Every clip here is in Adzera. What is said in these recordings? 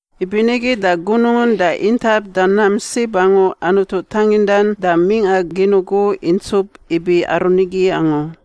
Ibinigi da gunungun da intap da nam sib angu Anutu tangindan da mingꞌa gin ugu intsup ibi aru nigi angu.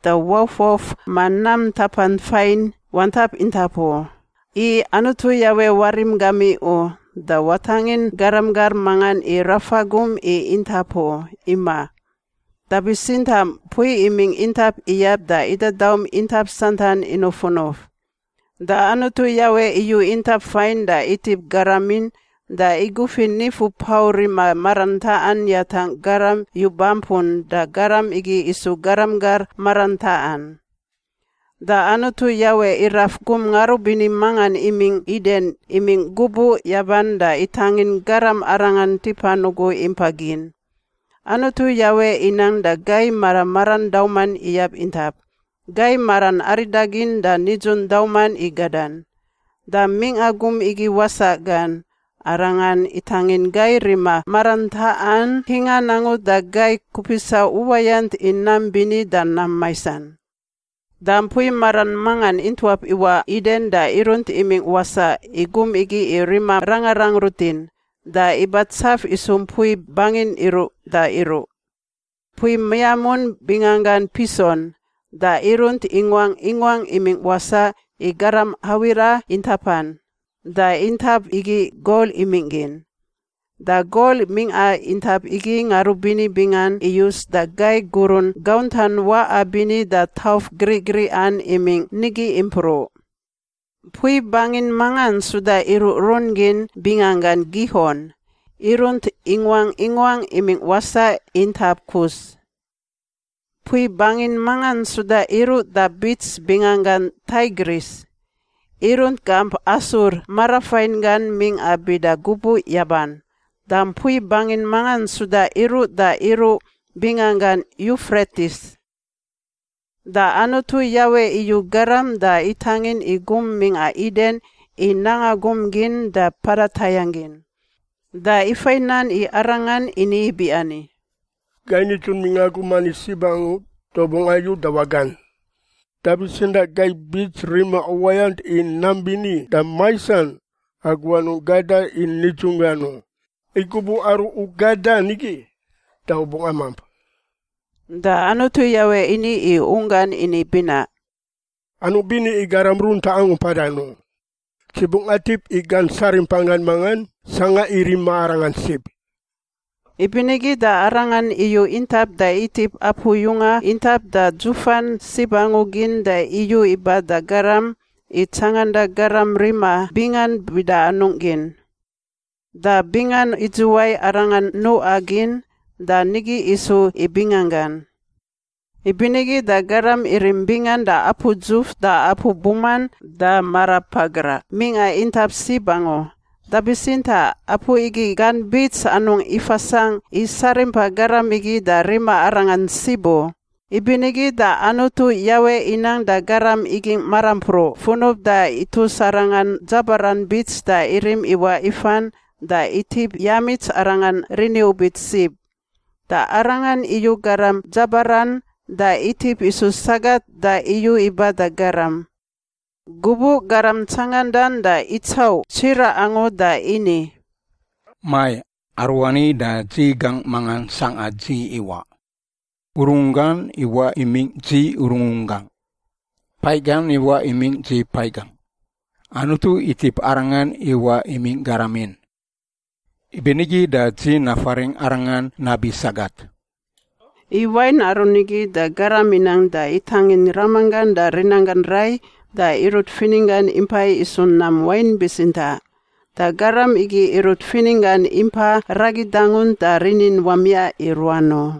da waufwauf ma nam ntapan fain wantap intap u, i Anutu Yawe warim gamiꞌ u da watangin garam gar mangan i rafa gum i intap u. Imaꞌ. Da bitsintaꞌ mpui imingꞌ intap iyab da idadaum intap santan inufunuf. Da Anutu Yawe iyu intap fain da itip garamin da igufi nifu pau rima marantaꞌan yatangꞌ garam yu-bampun da garam igi isu garam gar marantaꞌan. Da Anutu Yawe iraf gum ngarubini mangan imingꞌ Iden imingꞌ gubuꞌ yaban da itangin garam arangan tipan ugu impa gin. Anutu Yawe inang da gai mara maran dauman iyab intap, gai maran aridagin da nidzun dauman i gadan. Da mingꞌa gum igi wasaꞌ gan, arangan itangin gai rima marantaꞌan ntingan angu da gai kupisa uwayant i nam bini da nam maisan. Da mpui maran mangan intuap iwaꞌ Iden da irunt imingꞌ wasaꞌ i gum igi i rima rangarang rutin, da ibatsaf isu mpui bangin iruꞌ da iruꞌ. Mpui miamun bingangan Pison, da irunt inguangꞌ inguangꞌ imingꞌ wasaꞌ i garam Hawila intapan, da intap igi gol imingꞌ gin. (Da gol mingꞌa intap igi ngarubini bingan iyus, da gai gurun gauntan waꞌa bini da tauf griꞌgriꞌan imingꞌ nigi impruꞌ.) Mpui bangin mangan suda iruꞌrun gin bingangan Gihon, irunt inguangꞌ inguangꞌ imingꞌ wasaꞌ intap Kus. Mpui bangin mangan suda iruꞌ da bits bingangan Taigris, irunt gamp Asur marafain gan mingꞌa bida gubuꞌ yaban. Da mpui bangin mangan suda iruꞌ da iruꞌ binganggan Yufretis. Da Anutu Yawe iyu garam da itangin i gum mingꞌa Iden i nanga gum gin da mpada tayangꞌ gin. Da ifai nan i arangan ini ibiani, “Gai nidzun mingꞌa gum ani sib angu da u bungꞌ ayu da wagan, da bitsintaꞌ gai bits rima uwayant i nam bini da maisan, agu anungꞌ gada i nidzunggan u, i gubuꞌ aru u gadan igi da u bungꞌ amamp.” Da Anutu Yawe ini i unggan ini binaꞌ, “Anungꞌ bini i garam runtaꞌ angu mpadan u. Dzi bungꞌ atip i gan sarimpan gan mangan sangꞌa i rima arangan sib.” Ibinigi da Arangan iyu intap da itip apu yunga intap da dzufan sib angu gin da iyu iba da garam i tsanganda garam rima bingan bida anungꞌ gin. Da bingan idzuwai arangan nuꞌa gin, da nigi isu i binganggan. Ibinigi da garam irim bingan da apu dzuf da apu buman da marapagraꞌ mingꞌa intap sib angu, da bitsintaꞌ apu igi gan bits anungꞌ ifasangꞌ i sarimpa garam igi da rima arangan sib u. Ibinigi da Anutu Yawe inang da garam igingꞌ marampruꞌ funub da itus arangan dzabaran bits da irim iwaꞌ ifan, da itip yamits arangan riniubit sib. Da Arangan iyu garam dzabaran da itip isu sagat da iyu iba da garam. Gubuꞌ garam tsangandan da itsauꞌ tsiraꞌ angu da ini, “Mai! Aruani da dzi gangꞌ mangan sangꞌa dzi iwaꞌ. Urungunggan iwaꞌ imingꞌ dzi urungunggangꞌ; paiꞌ gan iwaꞌ imingꞌ dzi paiꞌ gangꞌ. Anutu itip arangan iwaꞌ imingꞌ garamin, ibinigi da dzi nafaringꞌ arangan nabi ‘sagat.’” I wain aru nigi da garam inang da itangin ramanggan da rinanggan rai da irut fininggan impai isu nam wain bitsintaꞌ. Da garam igi irut fininggan impa ragi dangunt da rinin wamiaꞌ i ruan u.